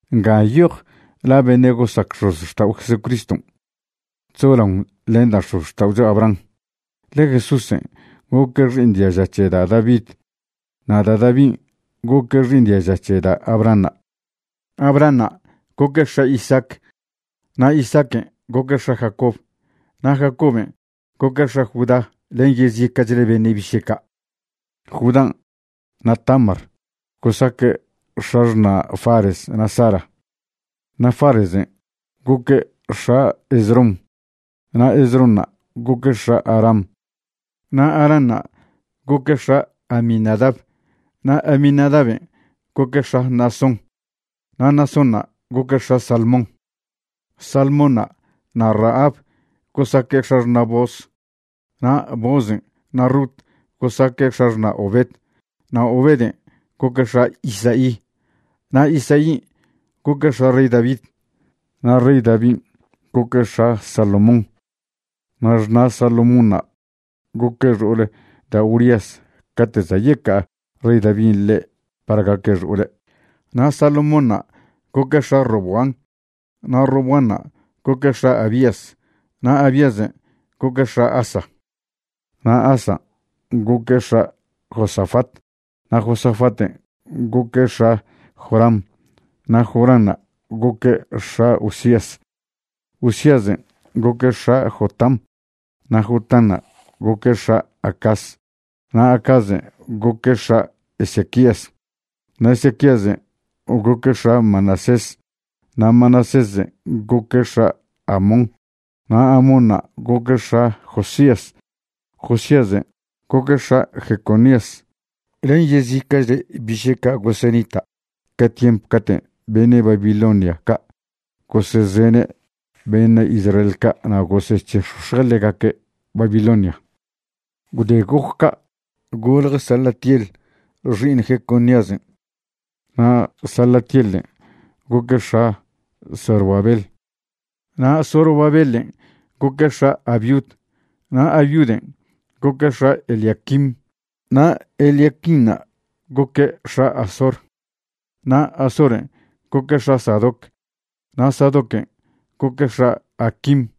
Nga nyoj la beṉe' gosac x̱ozxtao' Jesucriston' chzolaon len da' x̱ozxta'ocho Abraham. Ḻe Jesúsen' goque' xi'iṉ diaža c̱he da' David, na' da' Davin' goque' xi'iṉ diaža c̱he da' Abrahanṉa'. Abrahanṉa' goque' x̱a Isaac, na' Isaaquen' goque' x̱a Jacob, na' Jacoben' goque' x̱a Judá len yezica'chle beṉe' biše' ca'. Judán' na' Tamar gosaque' x̱axṉa' Fares na' Zara. Na' Faresen' goque' x̱a Esrom, na' Esronṉa' goque' x̱a Aram. Na' Aranṉa' goque' x̱a Aminadab, na' Aminadaben' goque' x̱a Naasón, na' Naasónṉa' goque' x̱a Salmón. Salmónṉa' na' Rahab gosaque' x̱axṉa' Booz. Na' Boozen' na' Rut gosaque' x̱axṉa' Obed. Na' Obeden' goque' x̱a Isaí. Na' Isaín' goque' x̱a rey David, na' rey Davin' goque' x̱a Salomón. Na' xṉa' Salomónṉa' goque' xo'ol da' Urías cate' za' yeca'a rey Davin' ḻe' par gaque' xo'ole'. Na' Salomónṉa' goque' x̱a Roboam, na' Roboanṉa' goque' x̱a Abías, na' Abíasen' goque' x̱a Asa. Na' Asan' goque' x̱a Josafat, na' Josafaten' goque' x̱a Joram, na' Joranṉa' goque' x̱a Uzías. Uzíasen' goque' x̱a Jotam, na' Jotanṉa' goque' x̱a Acaz, na' Acazen' goque' x̱a Ezequías. Na' Ezequíasen' goque' x̱a Manasés, na' Manasésen' goque' x̱a Amón, na' Amónṉa' goque' x̱a Josías. Josíasen' goque' x̱a Jeconías len yezica'chle biše' ca' gosenita' ca tiemp caten' beṉe' Babilonia ca' gosezene' beṉe' Israel ca' na' gosec̱he'x̱ox̱je' ḻegaque' Babilonian'. Gwde goc ca', golje Salatiel xi'iṉ Jeconíasen'. Na' Salatielen' goque' x̱a Zorobabel. Na' Zorobabelen' goque' x̱a Abiud, na' Abiuden' goque' x̱a Eliaquim. Na' Eliaquinṉa' goque' x̱a Azor. Na' Azoren' goque' x̱a Sadoc, na' Sadoquen' goque' x̱a Aquim.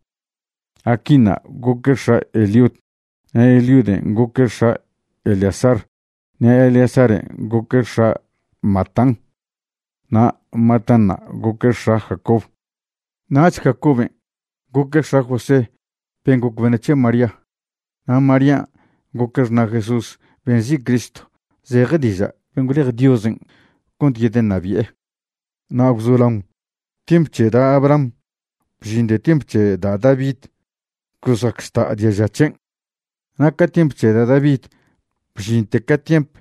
Aquinṉa' goque' x̱a Eliud. Na' Eliuden' goque' x̱a Eleazar, na' Eleazaren' goque' x̱a Matán. Na' Matánṉa' goque' x̱a Jacob. Nach Jacoben' goque' x̱a José ben' goc beṉe' c̱he María. Na' Marían' goque' xṉa' Jesús ben' nzi' Cristo, zeje diža' ben' gwlej Diosen' cont yedeṉabi'e. Na' gwzolaon tiemp c̱he da' Abraham bžinte tiemp c̱he da' David gosac žta' diaža c̱hen', na' ca tiemp c̱he da' David bžinte ca tiemp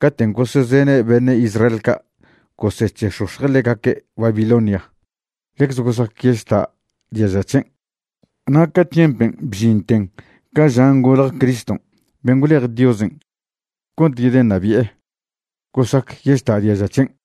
caten' gosezene' beṉe' Israel ca' gosec̱he'x̱ox̱je' ḻegaque' Babilonia, ḻecze gosac yežta' diaža c̱hen', na' ca tiempen' bžinten ca žan' golje Criston' ben' gwlej Diosen' cont yedeṉabi'e, gosac yežta' diaža c̱hen'.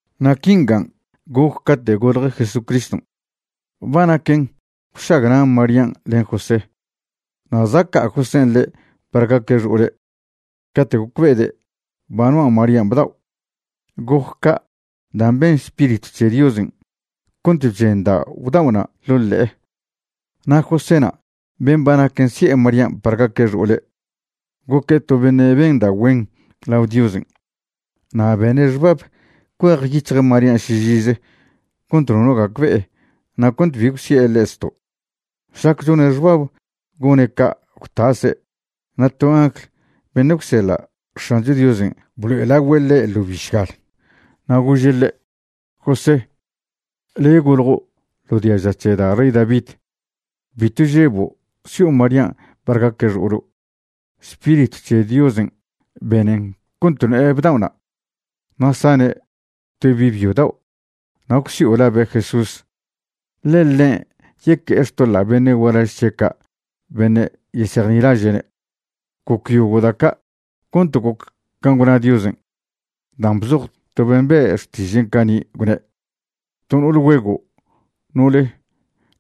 Na' quingan' goc cate' golje Jesucriston'. Ba naquen gwšagna' Marían' len José, na' za' ca'a Josén' ḻe' par gaque' xo'ole' cate' gocbe'ede' ba noa' Marían' bdao'. Goc ca' dan' ben Spiritw c̱he Diosen' cont bchendao' bdao'na' ḻo' ḻe'e. Na' Joséna' ben' ba naquen si'e Marían' par gaque' xo'ole', goque' to beṉe' ben da' güen lao Diosen'. Na' bene' xbab cuejyic̱hje' Marían' šižize cont nono gacbe'e na' cont bi gwsi'e ḻe' zto'. Šlac chone' xbab gone' ca' gwtase' na' to angl beṉe' gwseḻa' X̱ancho Diosen' blo'elagüe' ḻe' ḻo bišgal. Na' gože' ḻe': ―José, le' goljo' ḻo diaža c̱he da' rey David. Bitw žebo' si'o Marían' par gaque' xo'olo'. Spiritw c̱he Diosen' benen cont no'e bdao'na'. Na' sane' to bi' byo dao' na' gwsi'o labe' Jesús, ḻe ḻen' yeque'e xtoḻa' beṉe' gualaž c̱he' ca' beṉe' yesejnilaže'ne'. Goc yogo' da' ca' cont goc can' gwna Diosen' dan' bzoj to ben' be'e xtižen' cani', gwne': To no'ol güego' no'ole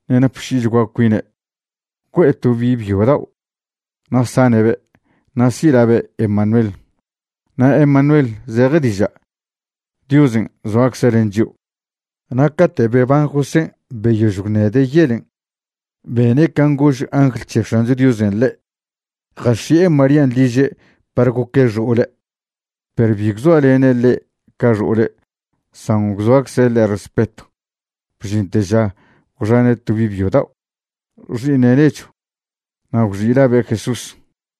ṉe' napši'ichgua cuine' güe'e to bi' byo dao' na' sane'be'. Na' si' labe' Emanuel. Na' Emanuel zeje diža': Diosen' zoacze' len chio'. Na' cate' beban Josén' beyož gwṉede' yelen', bene' can' gož angl c̱he X̱ancho Diosen' ḻe', jax̱i'e Marían' liže' par goque' xo'ole'. Perw bi gwzoalene' ḻe' ca xo'ole' san gwzoacze' ḻe' respetw bžinte ža gwxane' to bi' byo dao', xi'iṉe' nechw. Na' gwxi' labe' Jesús.